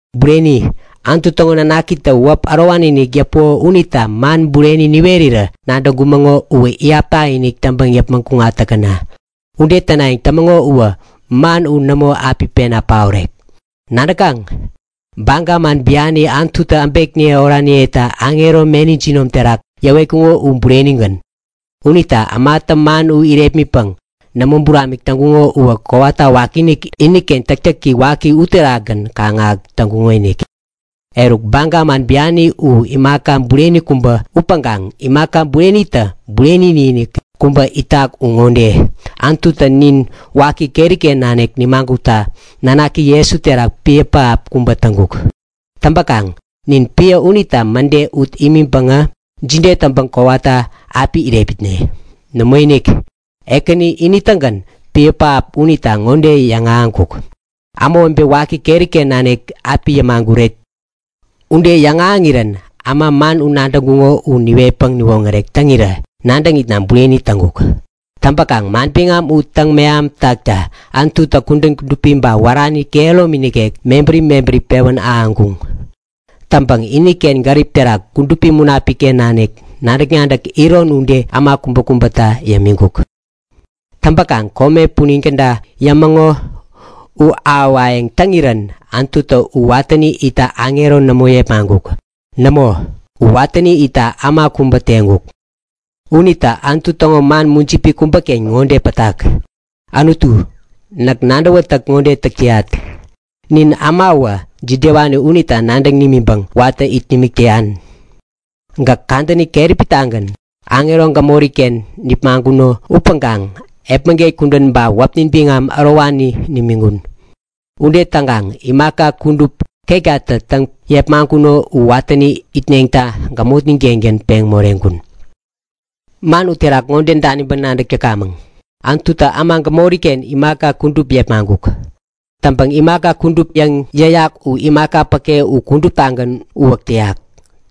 Bureni, Anutu täŋo nanakitä wäp ärowani-inik yäpuko unita man bureni niwerirä nadäŋkumäŋo uwä iyap takinik täŋpäŋ yäpmäŋ kuŋat täkäna. Ude tänayäŋ tämäŋo uwä man u nämo api pena paorek. Nadäkaŋ? Baga man biani Anututä äbekniye oraniyeta aŋero meni jinom terak yäwetkuko u burenigän. Unita ämatä man u irepmitpäŋ nämo buramik täŋkuŋo uwä kowata wakiinik iniken täktäki waki uterakgän kaŋ-ahäk täŋkuŋonik. Eruk, baga man biani u imaka bureni kubä upäŋkaŋ imaka burenitä bureni-inik kubä itak u ŋode; Anututä nin waki keri-ken nanik nimagutta nanaki Jesu terak piä pähap kubä täŋkuk. Täŋpäkaŋ nin piä unita mäde ut imiŋpäŋä jide täŋpäŋ kowata api irepmitne? Nämoinik, Ekäni ini-tägän piä pähap unita ŋode yäŋahäŋkuk; Ämawebe waki keri-ken nanik api yämaguret. Ude yäŋahäŋirän äma man u nadäŋkuŋo u niwetpäŋ niwoŋärek täŋirä nadäŋitna bureni täŋkuk. Täŋpäkaŋ manbiŋam u täŋ-mehamtäkta Anututä kudän kudupi ba wärani kehäromi nikek mebäri mebäri pewän ahäŋkuŋ. Täŋpäŋ iniken gärip terak Kudupi Munapik-ken nanik nadäk-nadäk iron ude äma kubäkubäta yämiŋkuk. Täŋpäkaŋ kome punin käda yämäŋo u ahäwayäŋ täŋirän Anututä u watäni itta aŋero nämo yepmaŋkuk. Nämo, u watäni itta äma kubä teŋkuk. Unita Anutu täŋo man mujipi kubäken ŋode pätak; Anutu, näk nadäwätäk ŋode täk täyat; Nin ämawä jidewani unita nadäŋ nimiŋpäŋ watä it nimik täyan? Gäk kadäni keräpi-tagän aŋero gämori-ken nipmaŋkuno upäŋkaŋ epmäget kudän ba wäpnin biŋam ärowani nimiŋkun. Ude täŋkaŋ imaka kudup ketkatä täŋ yepmaŋkuno u watäni itneta gämotnin-kengän peŋ moreŋkun. Man uterak ŋode daniŋpäŋ nadäk täkamäŋ; Anututä äma gämori-ken imaka kudup yepmaŋkuk. Täŋpäŋ imaka kudup yäŋ yäyak u imaka päke u kuduptagän uwäk täyak.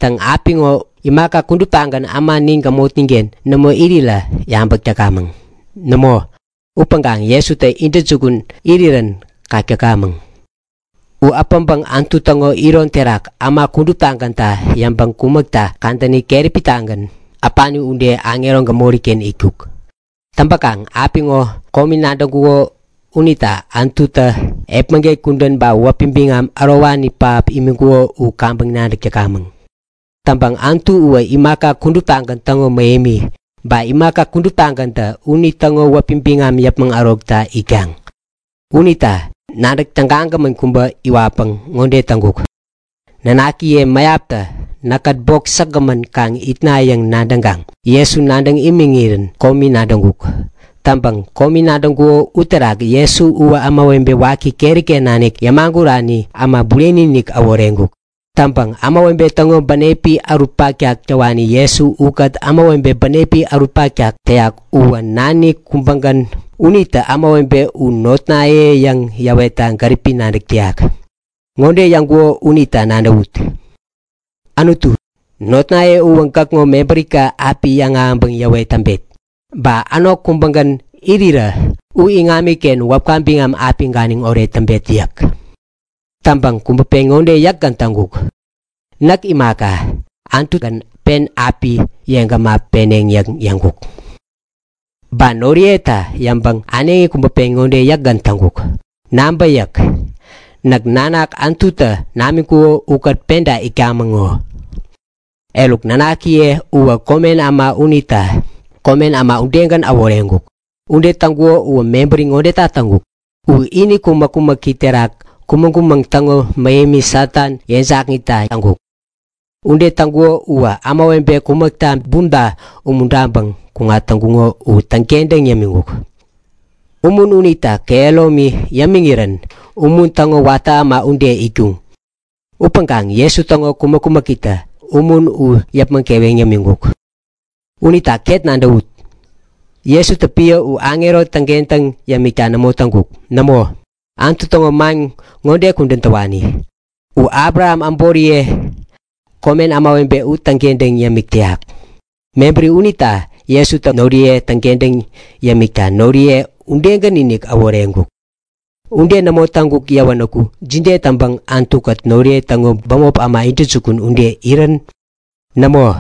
Täŋ, apiŋo imaka kuduptagän äma nin gämotnin-ken nämo irirä yabäk täkamäŋ. Nämo, upäŋkaŋ Jesutä intäjukun irirän kak täkamäŋ! U äpäŋpäŋ Anutu täŋo iron terak äma kuduptagänta yäŋpäŋ kumäkta kadäni keräpi-tagän, äpani ude, aŋero gämori-ken itkuk. Täŋpäkaŋ apiŋo komi nadäŋkuko unita Anututä epmäget kudän ba wäpi biŋam ärowani pähap imiŋkuko u kaŋpäŋ nadäk täkamäŋ. Täŋpäŋ Anutu uwä imaka kuduptagän täŋo mähemi. Ba imaka kuduptagäntä unitäŋo wäpi biŋam yäpmäŋ ärokta itkaŋ. Unita nadäk tägagämän kubä iwatpäŋ ŋode täŋkuk; Nanakiye mäyaptä näkkät bok säkgämän kaŋ itna yäŋ nadäŋkaŋ Jesu nadäŋ imiŋirän komi nadäŋkuk. Täŋpäŋ komi nadäŋkuko uterak Jesu uwä ämawebe waki keri-ken nanik yämagurani äma bureni-inik äworeŋkuk. Täŋpäŋ ämawebe täŋo bänepi ärut paktak täwani Jesu ukät ämawebe bänepi ärut paktak täyak uwä nani kubägän unita ämawebe u notnaye yäŋ yäwetta gäripi nadäk täyak. Ŋode yäŋkuko unita nadäwut; Anutu, notnaye uwä gäkŋo mebärika api yäŋahäŋpäŋ yäwet täŋpet. Ba änok kubägän irirä u iŋamiken wäpka biŋam api ganiŋ oret täŋpet yäk. Täŋpäŋ kubä pen ŋode yäkgän täŋkuk; Näk imaka, Anutugän pen api yeŋgäma peneŋ yäŋ yäŋkuk. Ba noriyeta yäŋpäŋ äneŋi kubä pen ŋode yäkgän täŋkuk; Nabä yäk. Näk nanak Anututä namiŋkuko ukät penta itkamäŋ ŋo! Eruk, nanakiye uwä komen äma unita komen äma udegän äworeŋkuk. Ude täŋkuko uwä mebäri ŋodeta täŋkuk; U ini kumäk-kumäki terak kumäŋ-kumäŋ täŋo mähemi Satan yeŋjakŋitta täŋkuk. Ude täŋkuko uwä ämawebe kumäkta bumta umuntaŋpäŋ kuŋat täŋkuŋo u täŋkentäŋ yämiŋkuk. Umun unitä kehäromi yepmäŋ irirän umun täŋo watä äma ude itkuŋ. Upäŋkaŋ Jesu täŋo kumäk-kumäkitä umun u yäpmäŋ keweŋ yämiŋkuk. Unita ket nadäwut! Jesutä piä u aŋero täŋkentäŋ yämikta nämo täŋkuk. Nämo, Anutu täŋo man ŋode kudän täwani; U Abraham äboriye, komen ämawebe u täŋkentäŋ yämik täyak. Mebäri unita Jesutä noriye täŋkentäŋ yämikta noriye udegän-inik äworeŋkuk. Ude nämo täŋkuk yäwänäku jide täŋpäŋ Anutu-kät noriye täŋo bämop äma intäjukun ude irän? Nämo,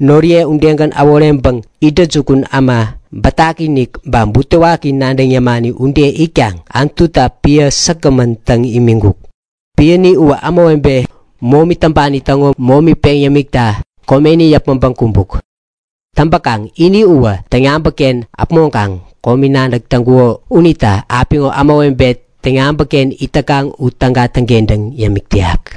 noriye udegän äworeŋpäŋ intäjukun äma bätaki-inik ba butewaki nadäŋ yämani ude itkaŋ Anututa piä säkgämän täŋ imiŋkuk. Piäni uwä ämawebe momi täŋpani täŋo momi peŋ yämikta komeni yäpmäŋpäŋ kumbuk. Täŋpäkaŋ ini uwä täŋ-yabäkken äpmoŋkaŋ komi nadäk täŋkuko unita apiŋo ämawebe täŋ-yabäkken it täkaŋ u täga täŋkentäŋ yämik täyak.